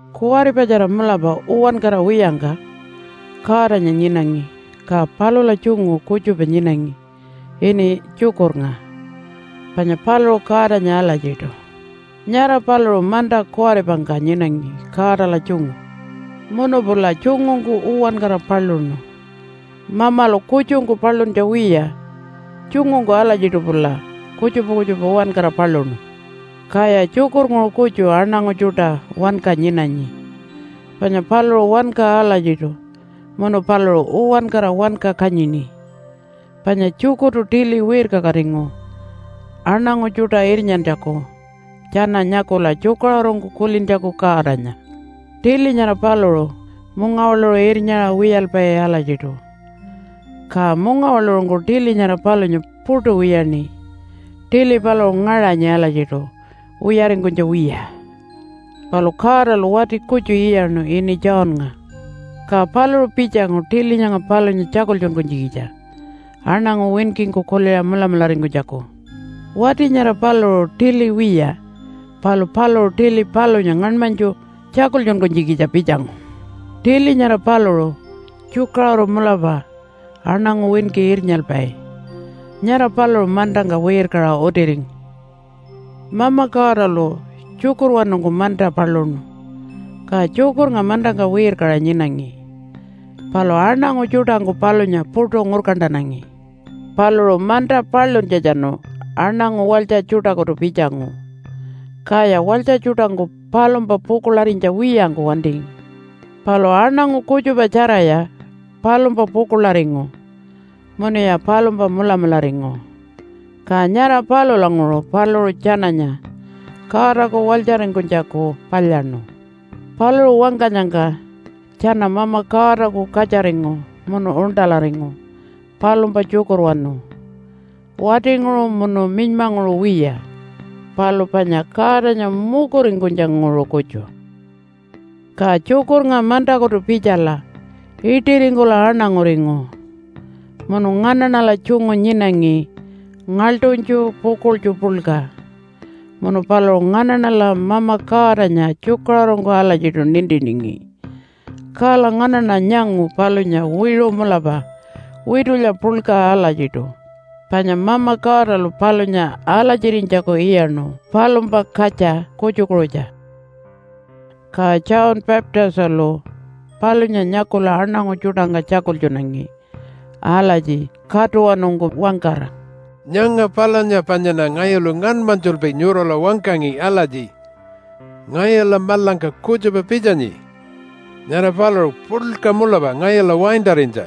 Kuwaripatjara mulapa uwankara wiyangka Godanya nyinangi, ka palula tjungu kutjupa nyinangi ini Tjukurnga. Panya paluṟu Godanya alatjiṯu. Nyara paluṟu manta kuwaripangka nyinangi Godala tjungu. Munu pula tjungungku uwankara paluṉu. Mamalu kutjungku paluntja wiya, tjungungku alatjiṯu pula kutjupa kutjupa uwankara paluṉu. Kaya Tjukurnguṟu kutju aṉangu tjuṯa wanka nyinanyi, panya paluṟu wanka alatjiṯu munu paluṟu uwankara wanka kanyini. Panya Tjukurtu tili wirkakatingu aṉangu tjuṯa irnyantjaku tjana nyakula tjukaṟurungku kulintjaku Godanya. Tili nyara paluṟu mungawaḻuṟu irnyaṟa wiyalpai alatjiṯu, ka mungawaḻuṟungku tili nyara palunya puṯu wiyaṉi. Tili paluṟu ngaṟanyi alatjiṯu wiyaringkunytja wiya. Palu Godalu wati kutju iyaṉu ini Johnnga. Ka paluṟu pitjangu tili nyanga palunya tjakultjunkunytjikitja aṉangu winkingku kuliṟa mulamularingkunytjaku. Wati nyara paluṟu tili wiya palu paluṟu tili palunya ngaṉmanytju tjakultjunkunytjikitja pitjangu. Tili nyara paluṟu tjukaṟuru mulapa aṉangu winki irnyalpai. Nyara paluṟu mantangka wirkaṟa utiringu. Mama Godalu Tjukurwanungku manta paluṉu. Ka Tjukurnga mantangka wirkaṟa nyinangi, palu aṉangu tjuṯangku palunya puṯu ngurkantanangi. Paluṟu manta paluntjatjanu aṉangu walytja tjuṯakutu pitjangu, kaya walytja tjuṯangku palumpa pukuḻarinytja wiyangku wantingi. Palu aṉangu kutjupa tjaraya palumpa pukuḻaringu munuya palumpa mulamularingu. Ka nyara palulanguṟu paluṟu tjananya Godaku walytjaringkunytjaku palyaṉu. Paluṟu wangkanyangka tjana Mama Godaku katjaringu munu uṉṯalaringu palumpa tjukurwanu. Watinguṟu munu minymanguṟu wiya, palu panya Godanya mukuringkunytjanguṟu kutju. Ka Tjukurnga mantakutu pitjala iṯiringkula aṉanguringu, munu nganaṉala tjungu nyinangi ngaḻṯunytju pukuḻtju puḻka, munu paluṟu nganaṉala Mama Godanya tjukaṟurungku alatjiṯu nintiningi. Kala nganaṉa nyangu palunya wiṟu mulapa witulya puḻka alatjiṯu, panya Mama Godalu palunya alatjirinytjaku iyaṉu palumpa katja kutjukuṟutja. Ka John Baptistalu palunya nyakula aṉangu tjuṯangka tjakultjunangi alatji katuwanungku wangkara, “Nyanga palunya panyaṉa ngayulu ngaṉmanytjulpi nyurala wangkangi alatji, ‘Ngayula maḻangka kutjupa pitjanyi. Nyara paluṟu puḻka mulapa ngayula waintarinytja.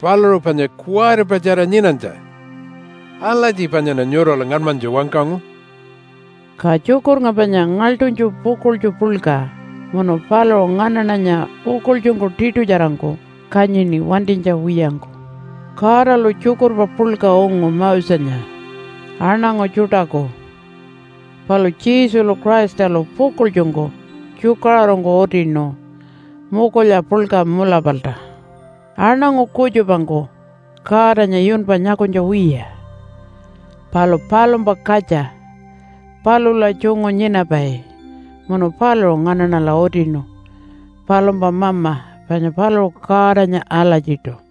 Paluṟu panya kuwaripatjara nyinanytja.’ Alatji panyaṉa nyurala ngaṉmanytju wangkangu.” Ka Tjukurnga panya ngaḻṯunytju pukuḻtju puḻka munu paluṟu nganaṉanya pukuḻtjungku tiṯutjarangku kanyini wantinytja wiyangku. Godalu tjukurpa puḻka ungu Mosenya aṉangu tjuṯaku, palu Jesulu Christalu pukuḻtjungku tjukaṟurungku utinu mukulya puḻka mulapalta. Aṉangu kutjupangku Godanya yunpa nyakunytja wiya. Palu palumpa katja palula tjungu nyinapai munu paluṟu nganaṉala utinu palumpa Mama, panya paluṟu Godanya alatjiṯu.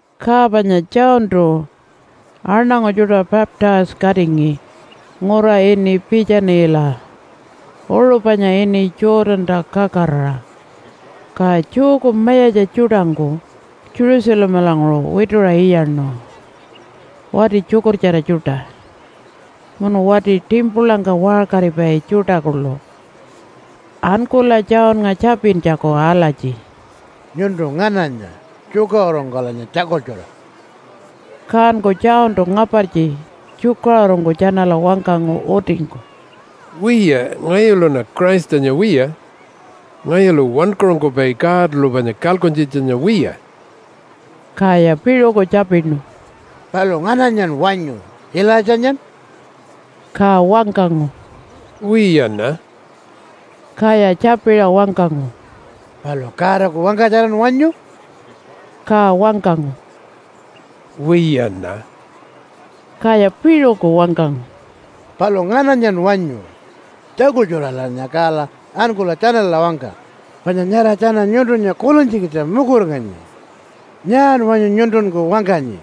Ka panya Johntu aṉangu tjuṯa baptise-katingi ngura ini Piitjanila uṟu panya ini Jordanta kakaraṟa. Ka Jewku mayatja tjuṯangku Jerusalemalanguṟu wituṟa iyaṉu wati tjukurtjara tjuṯa, munu wati timpulangka waṟkaripai tjuṯa kuḻu ankula Johnnga tjapintjaku alatji, “Nyuntu ngananya? Tjukaṟurungkulanya tjakultjura.” Kanku Johntu ngapartji tjukaṟurungku tjanala wangkangu utingku, “Wiya, ngayuluṉa Christanya wiya. Ngayulu Wankaṟunkupai Godalu panya kalkuntjitjanya wiya.” Kaya piṟuku tjapinu, “Palu ngananyan wanyu, Ilaitjanyan?” Ka wangkangu, “Wiyaṉa.” Kaya tjapiṟa wangkangu, “Palu Godaku wangkatjaran wanyu?” Ka wangkangu, “Wiyaṉa.” Kaya piṟuku wangkangu, “Palu ngananyan wanyu? Tjakultjuralanya kala ankula tjanala wangka, panya nyara tjana nyuntunya kulintjikitja mukuringanyi. Nyaan wanyu nyuntunku wangkanyi?”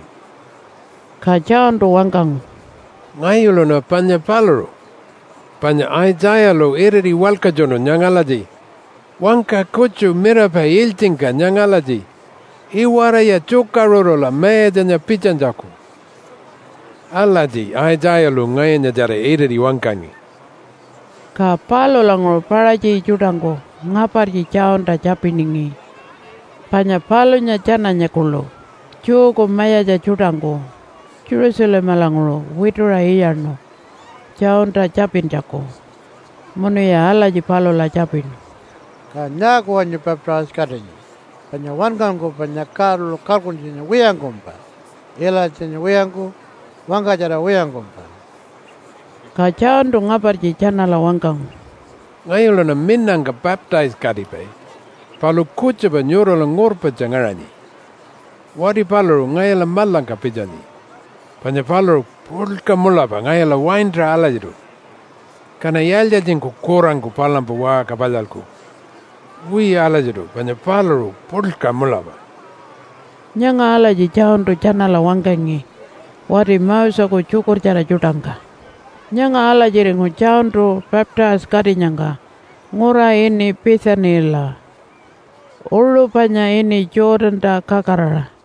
Ka Johntu wangkangu, “Ngayuluṉa panya paluṟu, panya Aitjayalu iriti walkatjunu nyanga alatji, ‘Wangka kutju mirapai ilytjingka nyanga alatji, “Iwaraya tjukaṟurula Mayatjanya pitjanytjaku.” ’ Alatji Aitjayalu ngayunyatjara iriti wangkangi.” Ka palulanguṟu Paṟatji tjuṯangku ngapartji Johnta tjapiningi, panya palunya tjananya kuḻu Jewku mayatja tjuṯangku Jerusalemalanguṟu wituṟa iyaṉu Johnta tjapintjaku. Munuya alatji palula tjapinu, “Kan nyaaku wanyu baptise-katinyi panya Wankaṟunkupainya Godalu kalkuntjitjanya wiyangkumpa, Ilaitjanya wiyangku, wangkatjara wiyangkumpa?” Ka Johntu ngapartji tjanala wangkangu, “Ngayuluṉa minangka baptise-katipai, palu kutjupa nyurala ngurpatja ngaṟanyi. Wati paluṟu ngayula maḻangka pitjanyi. Panya paluṟu puḻka mulapa ngayula waintaṟa alatjiṯu. Kaṉa yaaltji-yaaltjingku kurangku palumpa waṟka palyalku? Wiya alatjiṯu panya paluṟu puḻka mulapa.” Nyanga alatji Johntu tjanala wangkangi wati Moseku tjukurtjara tjuṯangka. Nyanga alatjiringu Johntu baptise-katinyangka ngura ini Piitjanila uṟu panya ini Jordanta kakaraṟa.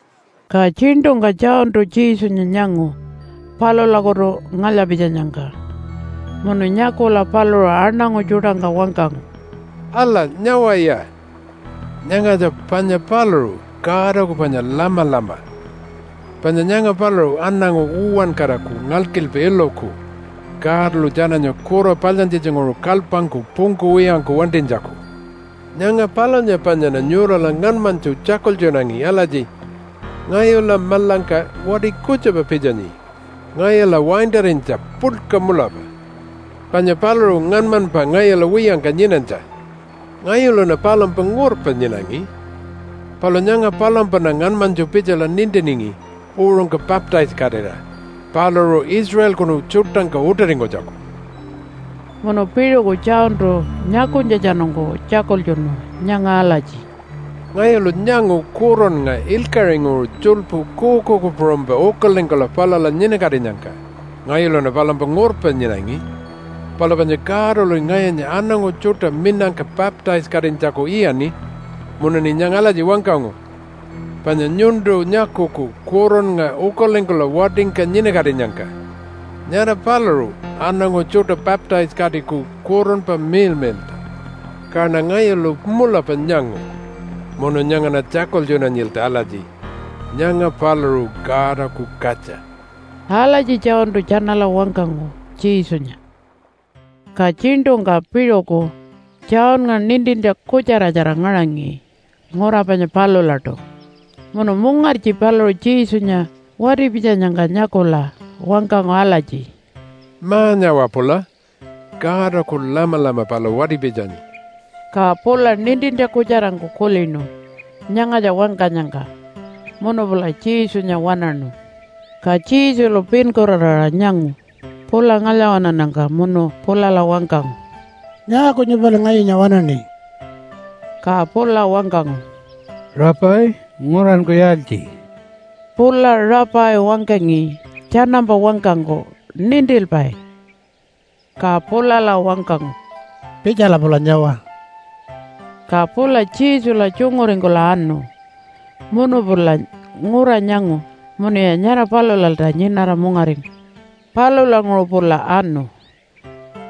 Ka tjiṉṯungka Johntu Jesunya nyangu palulakutu ngalya-pitjanyangka, munu nyakula paluṟu aṉangu tjuṯangka wangkangu, “Ala, nyawaya! Nyangatja panya paluṟu Godaku panya lamalama, panya nyanga paluṟu aṉangu uwankaraku ngalkilpa iluku Godalu tjananya kura palyantjitjanguṟu kalypangku pungkuwiyangku wantinytjaku. Nyanga palunya panyaṉa nyurala ngaṉmanytju tjakultjunangi alatji, ‘Ngayula maḻangka wati kutjupa pitjanyi ngayula waintarinytja puḻka mulapa, panya paluṟu ngaṉmanypa ngayula wiyangka nyinanytja.’ Ngayuluṉa palumpa ngurpa nyinangi, palu nyanga palumpaṉa ngaṉmanytju pitjala nintiningi uṟungka baptise-katira paluṟu Israelkunu tjuṯangka utiringkunytjaku.” Munu piṟuku Johntu nyakunytjatjanungku tjakultjunu nyanga alatji, “Ngayulu nyangu Kurunnga ilkaṟinguṟu tjuḻpu kuukuuku puṟunypa ukalingkula palula nyinakatinyangka. Ngayuluṉa palumpa ngurpa nyinangi, palu panya Godaluṉi ngayunya aṉangu tjuṯa minangka baptise-katinytjaku iyaṉi, munuṉi nyanga alatji wangkangu, ‘Panya nyuntu nyakuku Kurunnga ukalingkula watingka nyinakatinyangka, nyara paluṟu aṉangu tjuṯa baptise-katiku Kurunpa Miḻmiḻṯa.’ Kaṉa ngayulu mulapa nyangu munu nyangaṉa tjakultjunanyilta alatji, ‘Nyanga paluṟu Godaku katja.’” Alatji Johntu tjanala wangkangu Jesunya. Ka tjiṉṯungka piṟuku Johnnga nintintja kutjaratjara ngaṟangi ngura panya palulaṯu. Munu mungartji paluṟu Jesunya wati-pitjanyangka nyakula wangkangu alatji, “Ma-nyawa pula, Godaku lamalama pala wati-pitjanyi.” Ka pula nintintja kutjarangku kulinu nyangatja wangkanyangka munu pula Jesunya waṉaṉu. Ka Jesulu pinkuraraṟa nyangu pula ngalya-waṉannyangka munu pulala wangkangu, “Nyaaku nyupali ngayunya waṉaṉi?” Ka pula wangkangu, “Rabbi, nguranku yaaltji?” (Pula Rabbi wangkangi tjanampa wangkangku Nintilpai.) Ka pulala wangkangu, “Pitjala pula nyawa!” Ka pula Jesula tjunguringkula anu munu pula ngura nyangu munuya nyara palulalta nyinara mungaringu. Palulanguṟu pula anu,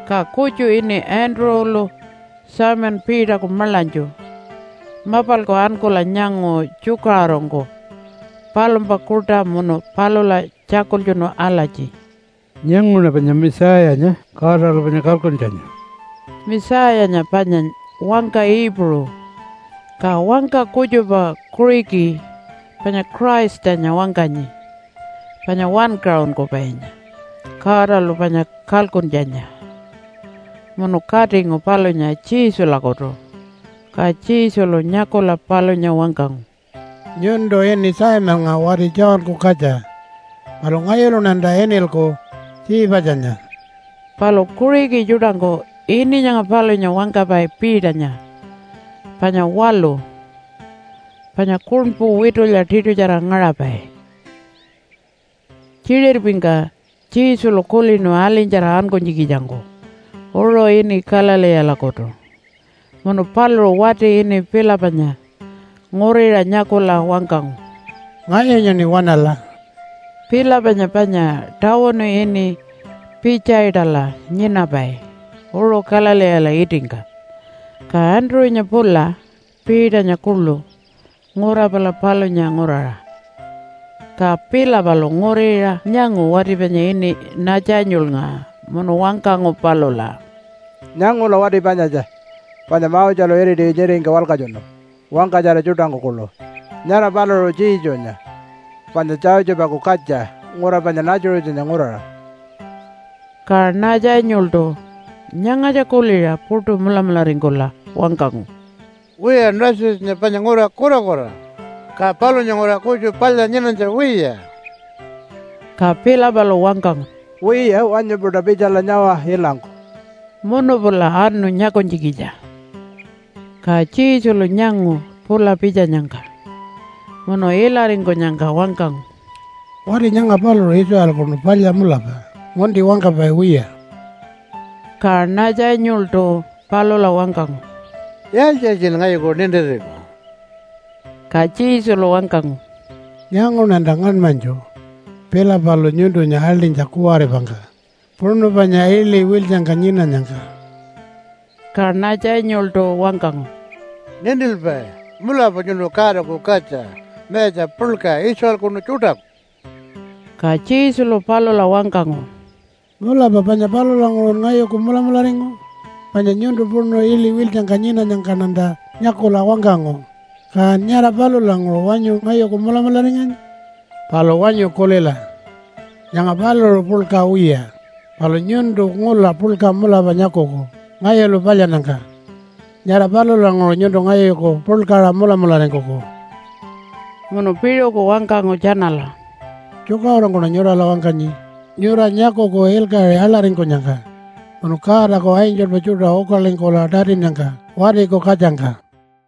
ka kutju ini Andrew-lu Simon Peterku maḻanytju mapalku ankula nyangu tjukaṟurungku palumpa kuṯa munu palula tjakultjunu alatji, “Nyanguṉa panya Messiah-nya Godalu panya Kalkuntjanya!” (Messiah-nya panya wangka Iipuṟu, ka wangka kutjupa Kuṟiki panya Christanya wangkanyi, panya Wankaṟunkupainya Godalu panya Kalkuntjanya.) Munu katingu palunya Jesulakutu. Ka Jesulu nyakula palunya wangkangu, “Nyuntu ini Simonnga wati Johnku katja. Palu ngayuluṉanta inilku Tjiipatjanya.” (Palu Kuṟiki tjuṯangku ini nyanga palunya wangkapai Peternya panya waḻu, panya kuṉpu witulya tiṯutjara ngaṟapai.) Tjiṟirpingka Jesulu kulinu alinytjara ankunytjikitjangku uṟu ini Galileelakutu. Munu paluṟu wati ini Philipanya nguriṟa nyakula wangkangu, “Ngayunyaṉi waṉala!” (Philipanya panya tawunu ini Pitjaitala nyinapai uṟu Galileela itingka. Ka Andrew-nya pula Peternya kuḻu ngura pala palunya nguraṟa.) Ka Philipalu nguriṟa nyangu wati panya ini Natjanyulnga munu wangkangu palula, “Nyangula wati panyatja, panya Moselu iriti nyiringka walkatjunu wangkatjara tjuṯangku kuḻu. Nyara paluṟu Jesunya panya Josephaku katja ngura panya Nazarethanya nguraṟa.” Ka Natjanyultu nyangatja kuliṟa puṯu mulamularingkula wangkangu, “Wiya Nazarethanya panya ngura kurakura, ka palunya nguraṟa kutju palya nyinanytja wiya?” Ka Philipalu wangkangu, “Wiya, wanyu-puṯa pitjala nyawa ilangku.” Munu pula anu nyakunytjikitja. Ka Jesulu nyangu pula pitjanyangka, munu ilaringkunyangka wangkangu, “Wati nyanga paluṟu Israelkunu palya mulapa, ngunti wangkapai wiya.” Ka Natjanyultu palula wangkangu, “Yaaltji-yaaltjin ngayuku nintiringu?” Ka Jesulu wangkangu, “Nyanguṉanta ngaṉmanytju Philipalu nyuntunya aḻṯinytja kuwaripangka, puṉu panya iḻi wiltjangka nyinanyangka.” Ka Natjanyultu wangkangu, “Nintilpai, mulapa nyuntu Godaku Katja, mayatja puḻka Israelkunu tjuṯaku.” Ka Jesulu palula wangkangu, “Mulapa panya palulanguṟun ngayuku mulamularingu? Panya nyuntu puṉu iḻi wiltjangka nyinanyangkaṉanta nyakula wangkangu, kan nyara palulanguṟu wanyu ngayuku mulamularinganyi? Palu wanyu kulila. Nyanga paluṟu puḻka wiya, palu nyuntu ngula puḻka mulapa nyakuku ngayulu palyannyangka. Nyara palulanguṟu nyuntu ngayuku puḻkaṟa mulamularingkuku.” Munu piṟuku wangkangu tjanala, “Tjukaṟurungkuṉa nyurala wangkanyi nyura nyakuku ilkaṟi aḻaringkunyangka munu Godaku angelpa tjuṯa ukalingkula tatinnyangka Watiku Katjangka.”